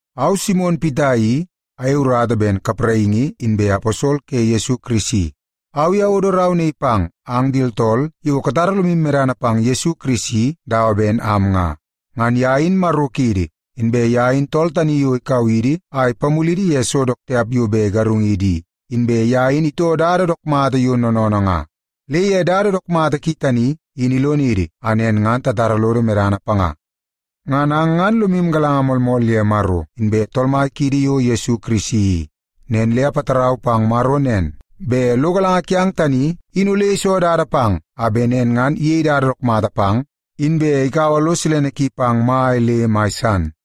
Au, Simon Pita i, ayei urata ben kapraingi inbe aposol ke Yesu Kirisi. Au i awodo rau naii pang ang di tooltool yo katara lomu medana pang Yesu Kirisi dawa ben am nga. Ngan ye in Maro kiidi, inbe ye in tool tani yo ikau idi a ipamulidi ye so dook tiap yo bet igarungidi i, inbe ye in itoo dada dook mata yo noonoonoo nga. Le ye dada dook mata ki tani, in ilonidi a nen ngan tatara lodo medana panga. Ngan ang ngan lomu galanga moolmool ye Maro inbe Tool Mai kiidi yo Yesu Kirisi i. Nen le apatarau pang Maro nen, bet lo galanga kiang tani in ole iso dada pang a bet nen ngan iyei dada dook mata pang, inbe ikaua lo silene ki pang mai le mai san.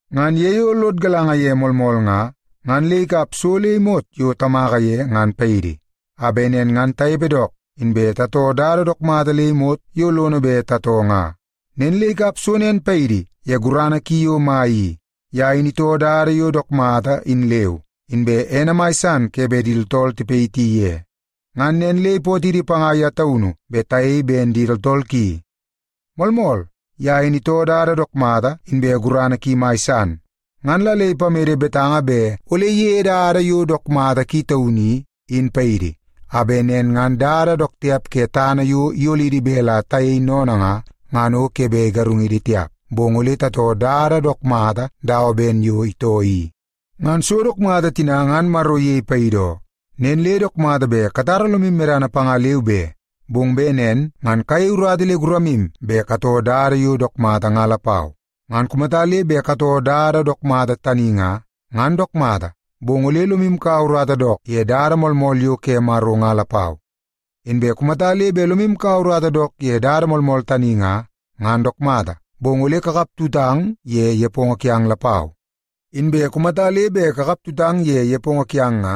Ngan ye yo lod galanga ye moolmool nga, ngan le ikap so le imot yo tamaka ye ngan paidi, a bet nen ngan tanepe dook, inbe tatoo dada dook mata le imot yo lono bet tatoo nga. Nen le ikap so nen paidi ye gurana ki yo mai i. Ye in itoo dada yo dook mata in leu, inbe ene mai san ke bet di tooltool tipayiti ye. Ngan nen le ipootidi panga ye taunu bet tayei ben di tooltool ki. Moolmool, ye in itoo dada dook mata inbe gurana ki mai san. Ngan la le ipamede betanga bet ole iyeie dada yo dook mata ki taunu i, in paidi, a bet nen ngan dada dook tiap ke tana yo iyolidi bet la tayei sennene nga, ngan o ke bet igarungidi tiap, bong ole tatoo dada dook mata dawa ben yo itoo i. Ngan so dook mata tina ngan Maro iyei paidi oo, nen le dook mata bet katara lomu medana panga leu be, bong bet nen ngan kayei urata le guramu bet katoo dada yo dook mata nga lapau. Ngan kumata le bet katoo dada dook mata tani nga, ngan dook mata, bong ole lomu kaua urata dook ye dada moolmool yo ke Maro nga lapau. Inbe kumata le bet lomu kaua urata dook ye dada moolmool tani nga, ngan dook mata, bong ole kakap tutang ye nepongo kiang lapau. Inbe kumata le bet kakaptutang ye nepongo kiang nga,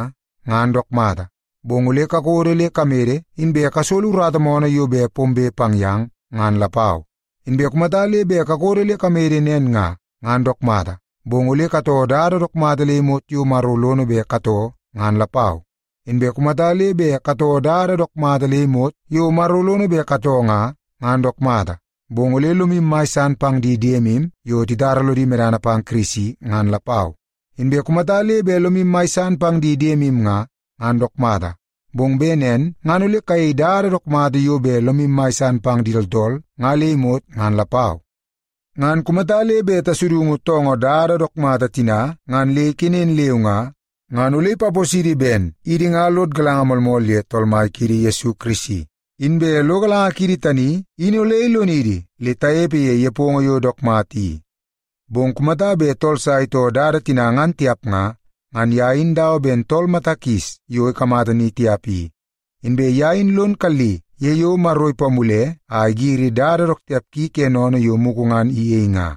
ngan dook mata, bong ole kakodo le kamede inbe kasolo urata moonoo yo bet pombe pang yang, ngan lapau. Inbe kumata le bet kakodo le kamede nen nga, ngan dook mata, bong ole katoo dada dook mata le imot yo Maro lono bet katoo ngan lapau. Inbe kumata le bet katoo dada dook mata le imot yo Maro lono bet katoo nga, ngan dook mata, bong ole lomu mai san pang di diemu yo titara lodi medana pang Kirisi ngan lapau. Inbe kumata le bet lomu mai san pang di diemu nga, ngan dook mata, bong bet nen ngan ole kayei dada dook mata yo bet lomu mai san pang di tooltool nga le imot ngan lapau. Ngan kumata le bet tasudungu toongoo dada dook mata tina ngan le ikenen leu nga, ngan ole ipaposidi ben idi nga lod galanga moolmool ye Tool Mai kiidi Yesu Kirisi, inbe lo galanga kiidi tani in ole ilonidi le tanepe ye nepongo yo dook mata i. Bong kumata bet tool sa itoo dada tina ngan tiap nga, ngan ye in dawa ben tool mata kis yo ikamata ni tiap i. Inbe ye in lon kalli ye yo Maro ipamule a igiri dada dook tiap ki ke sennene yo mugu ngan iyei nga.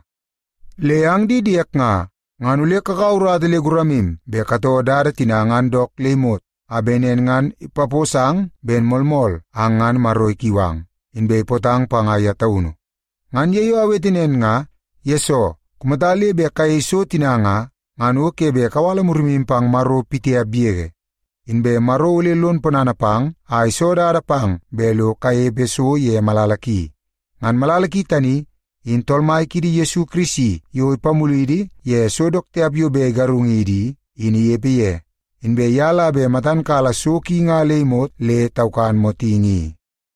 Le ang di diek nga, ngan ole kakaua urata le guramu bet katoo dada tina nga dook le imot, a bet nen ngan ipaposang ben moolmool ang ngan Maro ikiu ang, inbe ipootang panga ye taunu. Ngan ye yo awete nen nga, yesoo kumata le bet kayei so tina nga, ngan o ke bet kawala murimu pang Maro pitiap yege. Inbe Maro ole lon ponana pang a iso dada pang bet lo kanepe so ye malala ki. Ngan malala ki tani, in Tool Mai kiidi Yesu Kirisi yo ipamulidi ye so dook tiap yo bet igarungidi i, in inepe ye. Inbe ye la bet matan kala so ki nga le imot le taukan motingi i.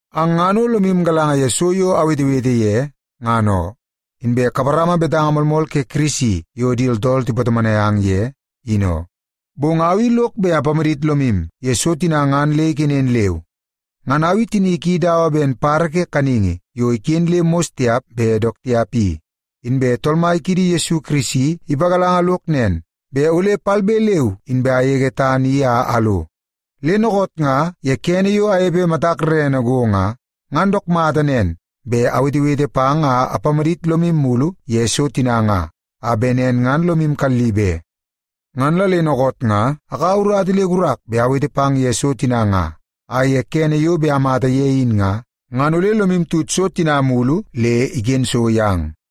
Ang ngan o lomu galanga ye so yo awetewete ye, ngan oo. Inbe kaparama betanga moolmool ke Kirisi yo di tooltool tipatomonai ang ye, in oo. Bong au i lok bet apamadit lomu ye so tina ngan le ikenen leu. Ngan au tinik i dawa ben badabada ke kaningi yo iken le mos tiap bet dook tiap i. Inbe Tool Mai kiidi Yesu Kirisi ipagalanga lok nen, bet ole palbe leu inbe agege tana i a alo. Le dookoot nga ye kene yo anepe matak rerene go nga, ngan dook mata nen bet awetewete pang a apamadit lomu mulu ye so tina nga, a bet nen ngan lomu kalli be. Ngan la le dookoot nga akaua urata le gurak bet awete pang ye so tina nga, a ye kene yo bet amata ye in nga, ngan ole lomu tut so tina mulu le iken so yang.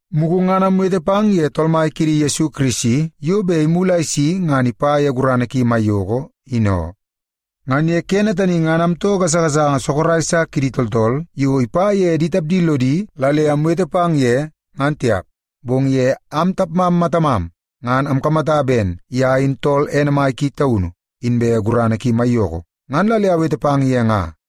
Mugu ngan amwete pang ye Tool Mai kiidi Yesu Kirisi yo bet imulu a isi ngan ipa ye gurana ki maiyoko in oo. Ngan ye kene tani ngan amtoo gasagasanga sorok sa kidi tooltool yo ipa ye di tapdi lodi la le amwete pang ye, ngan tiap. Bong ye am tapmam matamam, ngan amkamata ben ye in tool ene mai ki taunu, inbe gurana ki maiyoko, ngan la le awete pang ye nga.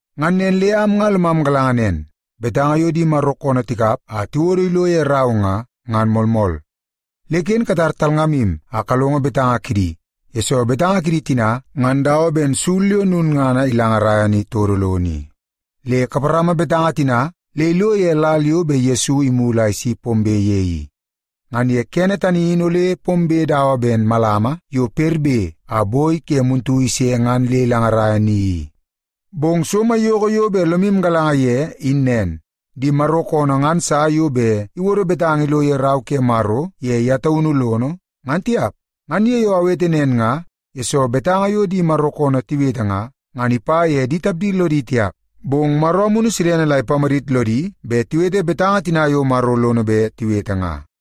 Ngan nen le am nga lomam galanga nen, betanga yo di Maro koonoo tikap a tiwodo ilo ye rau nga, ngan moolmool. Le ken katar talngamu a kalongo betanga kidi, yesoo betanga kidi tina ngan dawa ben sul yo lulngana ilangaraia ni todo lono i. Le kaparama betanga tina le ilo ye lal yo bet Yesu imulu a isi pombe ye i. Ngan ye kene tani in ole pombe dawa ben malama yo perbe a boi ke muntu ise ngan le ilangaraia ni i. Bong so maiyoko yo bet lomu galanga ye in nen: Di Maro koonoo ngan sa yo bet iwodo betanga ilo ye Rau ke Maro ye ye taunu lono, ngan tiap. Ngan ye yo awete nen nga, yesoo betanga yo di Maro koonoo tiwete nga, ngan ipa ye di tapdi lodi tiap, bong Maro Amunu Silene la ipamadit lodi bet tiwete betanga tina yo Maro lono bet tiwete nga.